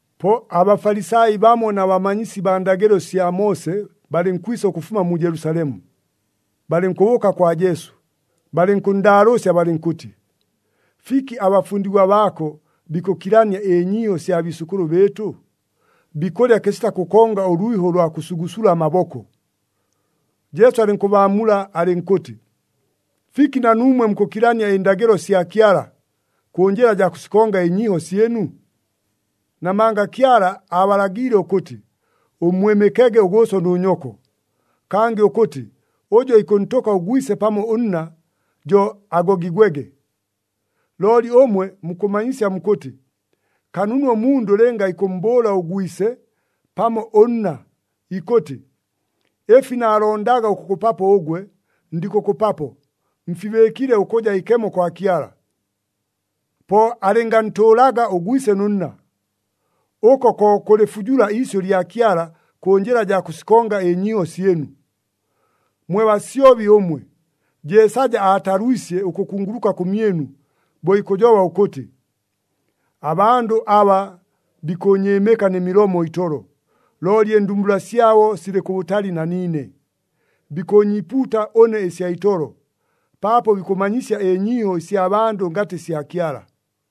Po aBafalisai bamo na bamanyisi baa ndagɨlo sya Moose balɨnkwisa ʉkʉfuma mu Jelusalemu. Balɨnkʉbʉʉka kwa Jesu, balɨnkʉnndaalʉʉsya balɨnkʉtɨ, “Fiki abafundigwa baako bikʉkilania ɨnyiiho sya biisʉkʉlʉ bɨɨtʉ? Bikʉlya kɨsita kʉkonga ʉlwiho ʉlwa kʉsugusula amaboko!” Jesu alɨnkʉbaamula alɨnkʉtɨ, “Fiki na nuumwe mukʉkilania ɨndagɨlo sya Kyala, kʉ njɨla jaa kʉsikonga ɨnyiiho syɨnu? Namanga Kyala aabalagiile ʉkʉtɨ, ‘Ʉmmwɨmɨkege ʉgʉʉso nʉ nyoko,’ kangɨ ʉkʉtɨ, ‘Ʉjʉ ikʉntʉka ʉgwise pamo ʉnna, jo agogigwege.’ Looli ʉmwe mukʉmanyisya mukʉtɨ, ‘Kanunu ʉmundʉ lɨnga ikʉmmbʉʉla ʉgwise pamo ʉnna, ikʉtɨ, “Ɨfi naalondaga ʉkʉkʉpapo ʉgwe, ndikʉkʉpapo, mfibɨɨkile ʉkʉja ikemo kwa Kyala.” ’ Po alɨngantʉʉlaga ʉgwise nʉ nna. Ʉko ko kʉlɨfujula iisyʉ lya Kyala kʉ njɨla jaa kʉsikonga ɨnyiiho syɨnu. Mwe basyobi ʉmwe! Jeesaja aatalwisye ʉkʉkunguluka kʉmyɨnu, bo ikʉjoba ʉkʉtɨ, ‘Abandʉ aba, bikʉʉnyɨɨmɨka nɨ milomo itolo, looli ɨndumbula syabo silɨ kʉbʉtali na niine. Bikʉʉnyiipuuta ʉne ɨsya itolo, paapo bikʉmanyisya ɨnyiiho ɨsya bandʉ ngatɨ sya Kyala.’”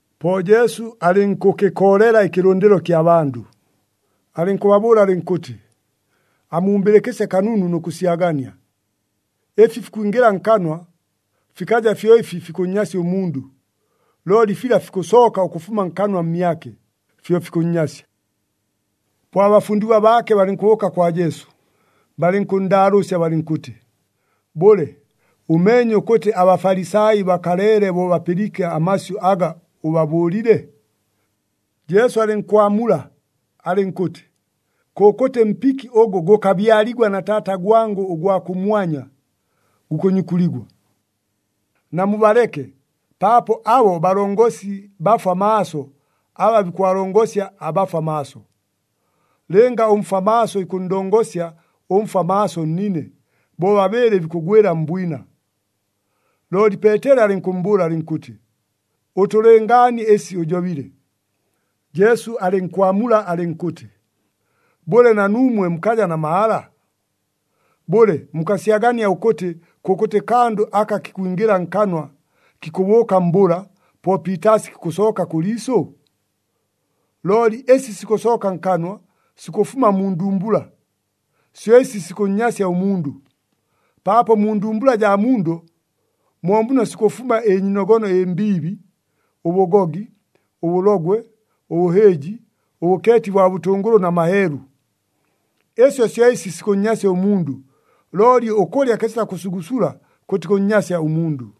Po Jesu alɨnkʉkɨkoolela ɨkɨlʉndɨlo kya bandʉ, alɨnkʉbabʉʉla alɨnkʉtɨ, “Amumbɨlɨkɨsye kanunu nʉ kʉsyagania! Ɨfi fikwingɨla nkanwa, fikaja fyo ɨfi fikʉnnyasya ʉmundʉ. Looli fila fikʉsooka ʉkʉfuma nkanwa mmyake, fyo fikʉnnyasya.” Po abafundigwa baake balɨnkʉbʉʉka kwa Jesu, balɨnkʉnndaalʉʉsya balɨnkʉtɨ, “Bʉle, ʉmeenye ʉkʉtɨ aBafalisai bakaleele bo bapɨliike amasyʉ aga ʉbabʉʉlile?” Jesu alɨnkwamula alɨnkʉtɨ, “Kʉkʉtɨ mpiki ʉgʉ gʉkabyaligwa na Taata gwangʉ ʉgwa kʉmwanya gukʉnyukuligwa. Namubaleke, paapo abo balongosi bafwa maaso aba bikʉbalongosya abafwa maaso! Lɨnga ʉmfwa maaso ikʉnndongosya ʉmfwa maaso nnine, bobabɨɨlɨ bikʉgwɨla mbwina!” Looli Peeteli alɨnkʉmmbʉʉla alɨnkʉtɨ, “Ʉtʉlɨngaanie ɨsi ʉjobile.” Jesu alɨnkwamula alɨnkʉtɨ, “Bʉle, na nuumwe mukaja na mahala? Bʉle, mukasyagania ʉkʉtɨ kʉkʉtɨ kandʉ aka kikwingɨla nkanwa, kikʉbʉʉka mbʉla, po piitaasi kikʉsooka kʉ liisʉ? Looli ɨsi sikʉsooka nkanwa, sikʉfuma mu ndumbula, syo ɨsi sikʉnnyasya ʉmundʉ. Paapo mu ndumbula jaa mundʉ, mo muno sikʉfuma ɨnyiinogono ɨmbiibi, ʉbʉgogi, ʉbʉlogwe, ʉbʉhɨɨji, ʉbʉkeeti bwa bʉtʉngʉlʉ na maheelu. Ɨsyo syo ɨsi sikʉnnyasya ʉmundʉ. Looli ʉkʉlya kɨsita kʉsugusula kʉtikʉnnyasya ʉmundʉ.”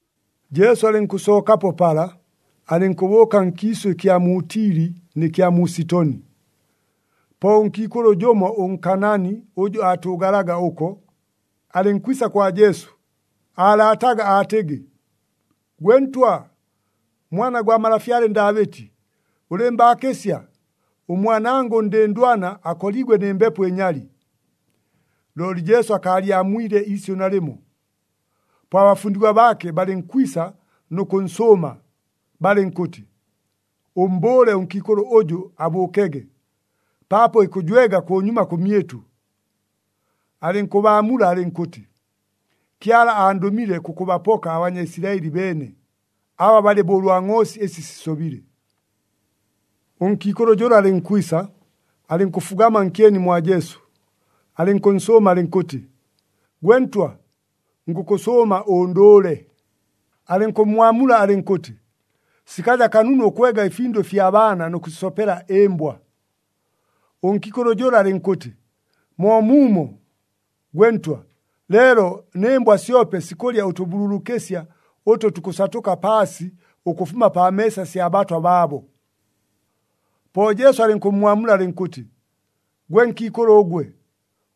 Jesu alɨnkʉsookapo pala, alɨnkʉbʉʉka nkiisʉ ɨkya mu Tili nɨ kya mu Sitoni. Po ʉnkiikʉlʉ jʉmo ʉNkaanaani ʉjʉ aatʉʉgalaga ʉko, alɨnkwisa kwa Jesu, aalaataga aatɨgɨ, “Gwe Ntwa, Mwana gwa malafyale Ndaabɨti, ʉlɨɨmbaakɨsya! Ʉmwanangʉ ʉndɨndwana akoliigwe nɨ mbepo ɨnyali.” Looli Jesu akaalyamwile iisyʉ nalɨmo. Po abafundigwa baake balɨnkwisa nʉ kʉnsʉʉma, balɨnkʉtɨ, “Ʉmmbʉʉle ʉnkiikʉlʉ ʉjʉ abʉʉkege, paapo ikʉjwega kʉnyuma kʉmyɨtʉ.” Alɨnkʉbaamula alɨnkʉtɨ, “Kyala andʉmile kʉkʉbapoka aBanyaisilaɨli beene, aba balɨ bo ʉlwa ngʼoosi ɨsi sisobile.” Ʉnkiikʉlʉ jʉla alɨnkwisa, alɨnkʉfugama nkyeni mwa Jesu, alɨnkʉnsʉʉma alɨnkʉtɨ, “Gwe Ntwa, ngʉkʉsʉʉma ʉndʉʉle!” Alɨnkʉmmwamula alɨnkʉtɨ, “Sikaja kanunu ʉkwega ɨfindʉ ɨfya baana nʉ kʉsisopela ɨmbwa.” Ʉnkiikʉlʉ jʉla alɨnkʉtɨ, “Moomuumo, gwe Ntwa, leelo nɨ mbwa syope sikʉlya ʉtʉbululukɨsya ʉtʉ tukʉsatʉka paasi ʉkʉfuma pa meesa sya batwa baabo.” Po Jesu alɨnkʉmmwamula alɨnkʉtɨ, “Gwe nkiikʉlʉ ʉgwe,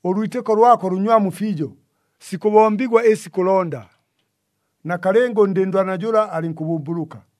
ʉlwitɨko lwako lʉnywamu fiijo! Sikʉbombigwa ɨsi kʉlonda.” Nakalɨnga, ʉndɨndwana jʉla alɨnkʉbʉmbʉlʉka.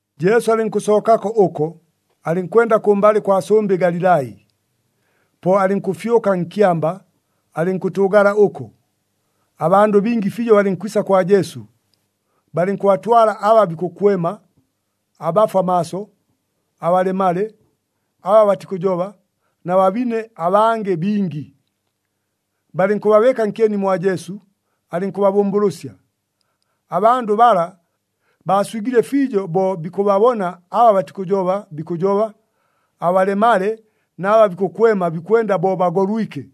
Jesu alɨnkʉsookako ʉko, alɨnkwenda kʉmbalɨ kwa sʉmbɨ Galilai. Po alɨnkʉfyʉka nkyamba, alɨnkʉtʉʉgala ʉko. Abandʉ bingi fiijo balɨnkwisa kwa Jesu, balɨnkʉbatwala aba bikʉkwema, abafwa maaso, abalemale, aba batikʉjoba, na babine abangɨ bingi. Balɨnkʉbabɨɨka nkyeni mwa Jesu, alɨnkʉbabʉmbʉlʉsya. Abandʉ bala baaswigile fiijo bo bikʉbabona aba batikʉjoba bikʉjoba, abalemale na aba bikʉkwema bikwenda bo bagolwike,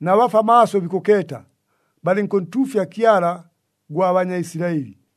na bafwa maaso bikʉkeeta. Balɨnkʉntuufya Kyala gwa Banyaisilaɨli.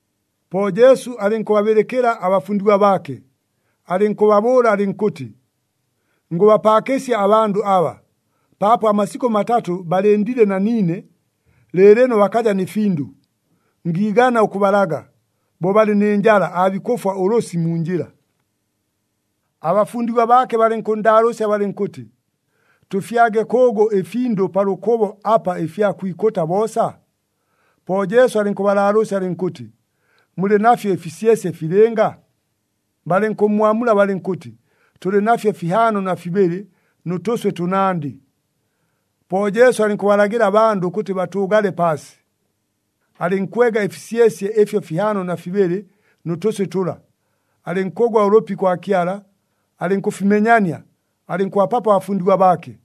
Po Jesu alɨnkʉbabɨlɨkɨla abafundigwa baake, alɨnkʉbabʉʉla alɨnkʉtɨ, “Ngʉbapaakɨsya abandʉ aba, paapo amasikʉ matatʉ balɨndile na niine, lɨɨlɨno bakaja nɨ findʉ. Ngiigana ʉkʉbalaga, bo balɨ nɨ njala aabikʉfwa ʉlʉsɨ mu njɨla.” Abafundigwa baake balɨnkʉnndaalʉʉsya balɨnkʉtɨ, “Tʉfyage kʉʉgʉ ɨfindʉ pa lʉkʉbo apa ɨfya kwikʉta boosa?” Po Jesu alɨnkʉbalaalʉʉsya alɨnkʉtɨ, “Mulɨ nafyo ɨfisyesye filɨnga?” Balɨnkʉmmwamula balɨnkʉtɨ, “Tʉlɨ nafyo fihaano na fibɨlɨ, nʉ tʉswɨ tʉnandɨ.” Po Jesu alɨnkʉbalagɨla abandʉ ʉkʉtɨ batʉʉgale paasi. Alɨnkwega ɨfisyesye ɨfyo fihaano na fibɨlɨ nʉ tʉswɨ tʉla, alɨnkʉgwa ʉlʉpi kwa Kyala, alɨnkʉfimenyania, alɨnkʉbapapo abafundigwa baake,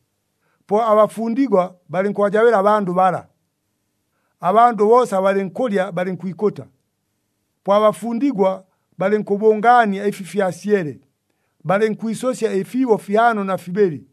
po abafundigwa balɨnkʉbajabɨla abandʉ bala. Abandʉ boosa balɨnkʉlya, balɨnkwikʉta. Po abafundigwa balɨnkʉbʉngaania ɨfi fyasyele, balɨnkwisʉsya ɨfiibo fihaano na fibɨlɨ.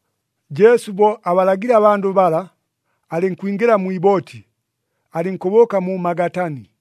Jesu bo abalagile abandʉ bala, alɨnkwingɨla mwi ibooti, alɨnkʉbʉʉka mu Magatani.